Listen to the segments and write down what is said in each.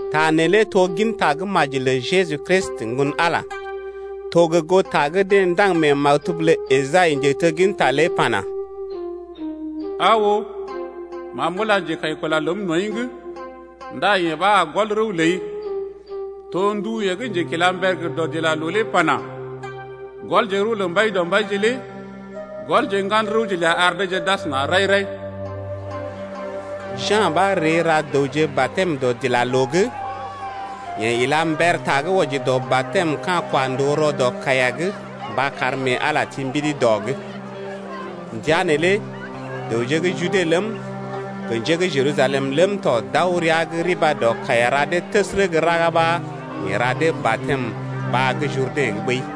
Ta neelé to gin tagə́maji lə Jeju Kristi, Ŋgon-Ala lé. To gə goo ta gə́ deḛ ndaŋg mee maktub’g lə Esai, njetegginta lé pana: Aa oo, ma m’ula njekaḭkula ləm nɔḭ’g Ndá yeḛ ɓa a gɔl rəw ləi. To ndu yeḛ gə́ njekilamber gə dɔdilaloo lé pana: Gɔlje rəw lə Mbaidɔmbaije lé Gɔlje ŋgan rəwje ləa ar deeje d’asəna rai-rai. Ja̰ ɓa ree ra dəwje batɛm dɔdilaloo’g. Yeḛ ila mber ta gə́ wɔji dɔ batɛm ka̰ kwa ndòo rɔ dɔ kaiya’g mba kar mee Ala lé ti mbidi dɔ’g. Ndəa neelé dəwje gə́ Jude ləm, gə njé gə́ Jerusalem ləm tɔ d’aw rəa’g riba dɔ kaiya ra dee təsərə gə́ raga ɓa yeḛ ra dee batɛm ta baa gə́ Jurdɛ̰’g ɓəi.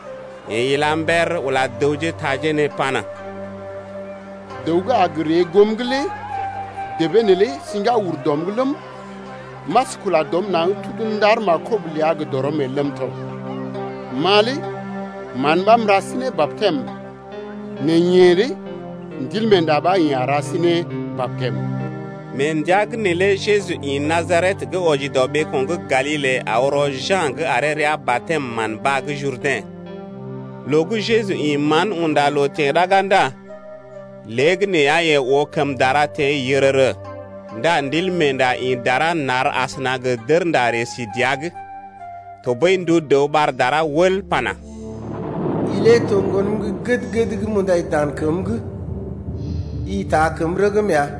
Yeḛ ila mber ula dəwje taje nee pana: Dəw gə́ a gə ree goom’g lé debee neelé siŋgá ur dɔm’g ləm, m’as kula dɔm naŋg tudu ndar markob ləa gə dɔrɔm el ləm tɔ. Ma lé mán ɓa m’ra sí ne batɛm nɛ yeḛ lé Ndilmeenda ɓa yeḛ a ra sí ne batɛm. Mee ndəa’g neelé Jeju ḭ Najaret gə́ wɔji dɔ ɓeeko̰ gə́ Galile aw rɔ Ja̰’g aree rəa batɛm mán baa gə́ Jurdɛ̰. Loo gə́ Jeju ḭ mán unda loo teḛ raga ndá léegəneeya yeḛ oo kəm dara teḛ yərərə, ndá Ndilmeenda ḭ dara nar asəna gə dərnda ree sí dəa’g. Tɔɓəi ndu ɓar dara wəl pana: I lé to ŋgonəm gə́ gəd-gəd gə́ m’undai dan kəm’g, i taa kəm rəgm ya.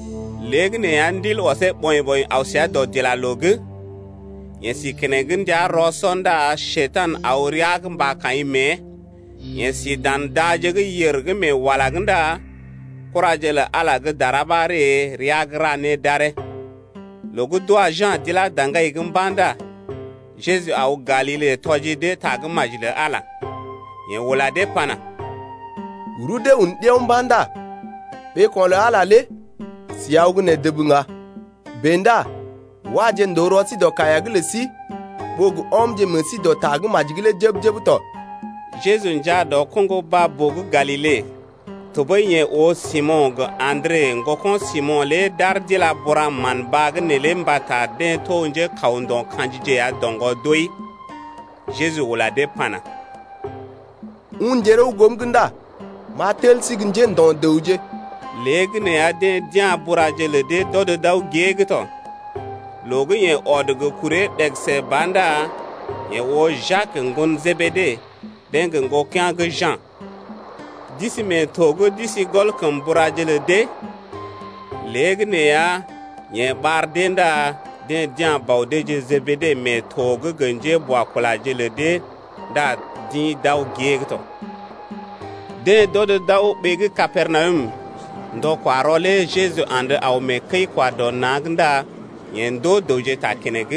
Léegəneeya Ndil ɔsee ɓɔḭ-ɓɔḭ aw səa dɔdilaloo’g. Yeḛ si keneŋ ndəa rɔ-sɔ ndá Njekurai aw rəa’g mba kaḭ mée. Yeḛ si dan daje gə́ yèr gə́ mee wala’g ndá kuraje lə Ala gə́ dara ɓa ree rəa’g ra né d’aree. Loo gə́ d’wa Ja̰ d’ilá daŋgai’g mba̰ ndá Jeju aw Galile tɔji dee tagə́maji lə Ala lé. Yeḛ ula dee pana: Rudee un ɗiao mba̰ ndá ɓeeko̰ lə Ala lé si aw gə́ nee dəb ŋga. Bèe ndá waje ndòo rɔ sí dɔ kaiya’g lə sí ɓó gə ɔmje meḛ sí dɔ tagə́maji’g lé jəb-jəb tɔ. Jeju njaa dɔ koŋgo baa-boo gə́ Galile, tɔɓəi yeḛ oo Simo̰ gə Andre, ŋgoko̰ Simo̰ lé d’aar d’ila bura mán baa’g neelé mbata deḛ lé to gə́ njékaw ndo̰ ka̰jije ya doŋgɔ doi. Jeju ula dee pana: Unje rəw goom’g ndá m’a tel sí gə́ njḛ́do̰-dəwje. Léegəneeya deḛ d’ya̰ buraje lə dee d’ɔm na̰ gée’g tɔ. Loo gə́ yeḛ ɔd gə kuree ɗegəse ba ndá yeḛ oo Jak ŋgon Jebede, deḛ gə́ ŋgokea̰ gə́ Ja̰. D’isi mee to’g d’isi gɔl kəm buraje lə dee. Léegəneeya, yeḛ ɓar dee ndá deḛ d’ya̰ bɔ deeje Jebede mee to’g gə njéboakulaje lé ndá d’ḭ d’aw gée’g tɔ. Deḛ d’ɔd d’aw ɓee gə́ Kapernawum. Ndɔ-kwa-rɔ lé Jeju andə aw mee kəi-kwa-dɔ-na̰’g ndá yeḛ ndoo dəwje ta keneŋ.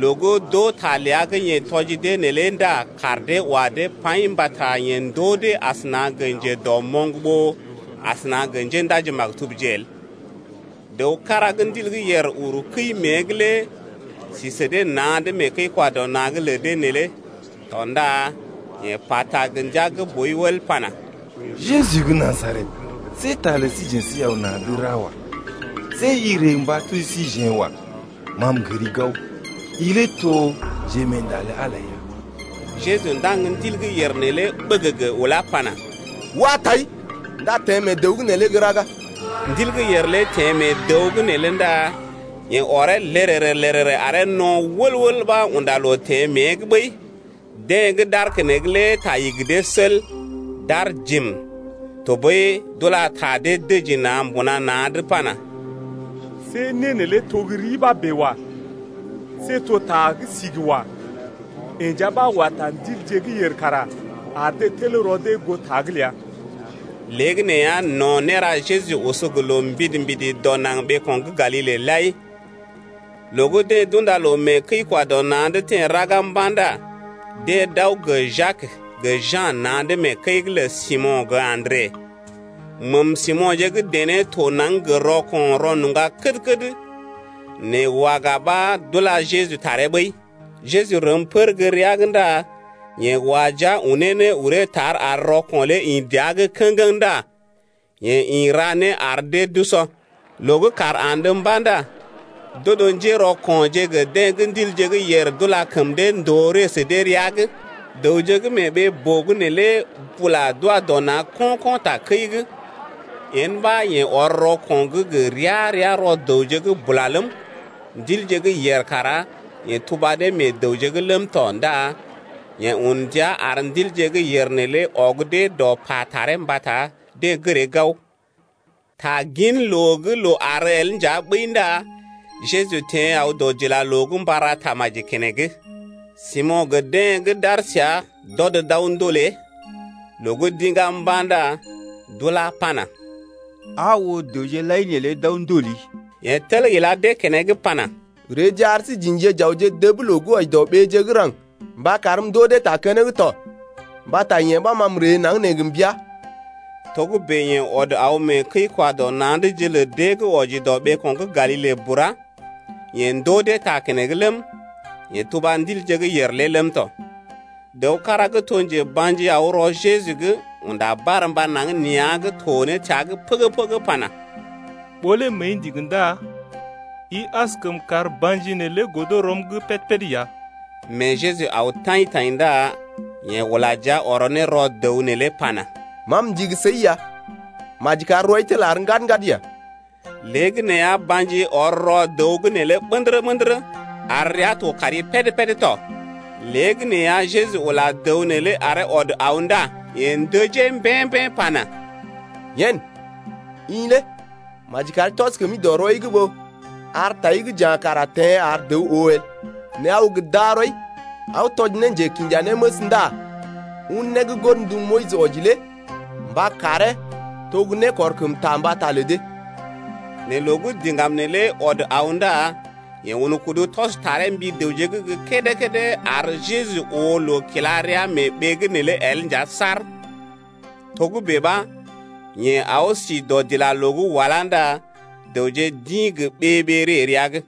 Loo gə́ d’oo ta ləa gə́ yeḛ tɔji dee neelé ndá kaar dee wa dee paḭ mbata yeḛ ndoo dee asəna gə njedɔmoŋ ɓó asəna gə njéndaji-maktubje el. Dəw kára gə́ ndil gə́ yèr uru kəi mée’g lé si sə dee na̰’d mee kəi-kwa-dɔ-na̰’g lə dee neelé tɔ ndá yeḛ pata gə ndia gə́ boi wəl pana: Jeju gə́ Najaret, see ta lə síjeḛ səi aw na̰’d ra wa. See i ree mba tuji síjeḛ wa. Ma m’gəri gao, i lé to Njemeenda lə Ala ya. Jeju ndaŋg ndil gə́ yèr neelé ɓəgəgə ulá pana: Wa tai! ndá teḛ mee dəw’g neelé gə́ raga. Ndil gə́ yèr lé teḛ mee dəw’g neelé ndá yeḛ oree lərərə-lərərə aree no̰ wəl-wəl ɓa unda loo teḛ mée’g ɓəi. Deḛ gə́ d’aar keneŋ lé ta igi dee sel, d’aar jim. Tɔɓəi d’ula ta dee dəji na̰ mbuna na̰’d pana: See né neelé to gə́ ri ɓa bèe wa. See to ta gə́ sigi wa. Yeḛ nja ɓa wa ta ndilje gə́ yèr kara ar dee tel rɔ dee goo ta’g ləa. Léegəneeya no̰ néra Jeju oso gə loo mbidi-mbidi dɔ naŋg ɓeeko̰ gə́ Galile lai. Loo gə́ deḛ d’unda loo mee kəi-kwa-dɔ-na̰’d teḛ raga mba̰ ndá deḛ d’aw gə Jak gə Ja̰ na̰’d mee kəi’g lə Simo̰ gə Andre. Məm Simo̰je gə́ dené to naŋg gə rɔko̰ rɔnuŋga kəd-kəd, nɛ waga ɓa d’ula Jeju taree ɓəi. Jeju rəm pər gə́ rəa’g ndá yeḛ wa jia unee ne uree tar ar rɔko̰ lé ḭ dəa’g kə̰geŋ ndá yeḛ ḭ ra né ar dee d’usɔ. Loo gə́ kàr andə mba̰ ndá d’odo njérɔko̰je gə deḛ gə́ ndilje gə́ yèr d’ula kəm dee ndòo ree sə dee rəa’g, Dəwje gə́ mee ɓee-boo’g neelé bula d’wa dɔ na̰ ko̰-ko̰ takəi’g. Yen ɓa yeḛ ɔr rɔko̰ gə́ gə ria-ria rɔ dəwje’g bula ləm, ndilje gə́ yèr kara yeḛ tuba dee meḛ dəwje’g ləm tɔ ndá yeḛ un ndia ar ndilje gə́ yèr neelé ɔg dee dɔ pa taree mbata deḛ gəree gao. Taginloo gə́ loo àr el nja ɓəi ndá Jeju teḛ aw dɔdilaloo’g mba ra tamaji keneŋ. Simo̰ gə deḛ gə́ d’aar səa, d’ɔd d’aw ndolee. Loo gə́ d’iŋgá mba̰ ndá d’ula pana: Aa oo, dəwje lai neelé d’aw ndoli. Yeḛ tel ila dee keneŋ pana: Reeje ar sí j’ḭje j’awje dəb loo gə́ wɔji dɔ ɓeeje gə́ raŋg mba karm m’ndoo dee ta keneŋ tɔ mbata yee ɓa ma m’ree naŋg nee gə mbəa ya. Togə́bè yeḛ ɔd aw mee kəi-kwa-dɔ-na̰’dje lə deḛ gə́ wɔji dɔ ɓeeko̰ gə́ Galile bura. Yeḛ ndoo dee ta keneŋ ləm, yeḛ tuba ndilje gə́ yèr lé ləm tɔ. Dəw kára gə́ to njeba̰ji aw rɔ Jeju’g, unda barmba naŋg nea̰’g to ne təa’g pəgə-pəgə pana: Ɓó lé məəi ndigi ndá i askəm kar ba̰ji neelé godo rɔm’g péd-péd ya. Mee Jeju aw taḭ-taḭ ndá yeḛ ula jia ɔrɔ ne rɔ dəw neelé pana: Ma m’ndigi səi ya, maji kar rɔi tel ɔr ɓə̰dərə-ɓə̰dərə ya. Léegəneeya ba̰ji lé ɔr rɔ dəw’g lé ɓə̰dərə-ɓə̰dərə, ar rəa to kari péd-péd tɔ. Léegəneeya Jeju ula dəw neelé aree ɔd aw ndá yeḛ ndəjee bər-bər pana: Yen, i lé maji kari tɔs kəmi dɔ rɔi’g ɓó ar tai gə́ ja̰ kara teḛ ar dəw oo el. Nɛ aw gə darɔi aw tɔji njekinjanéməs ndá un né gə́ godndu Moyis wɔji lé mba karee to ne nékɔrkəmta mbata lə dee. Nɛ loo gə́ diŋgam neelé ɔd aw ndá yeḛ un kudu tɔs taree mbi dəwje’d gə́ kédé-kédé, ar Jeju oo loo kila rəa mee ɓee’g neelé el nja saar. Togə́bè ɓa yeḛ aw si dɔdilaloo’g walá ndá dəwje d’ḭ gə ɓee-ɓee ree rəa’g.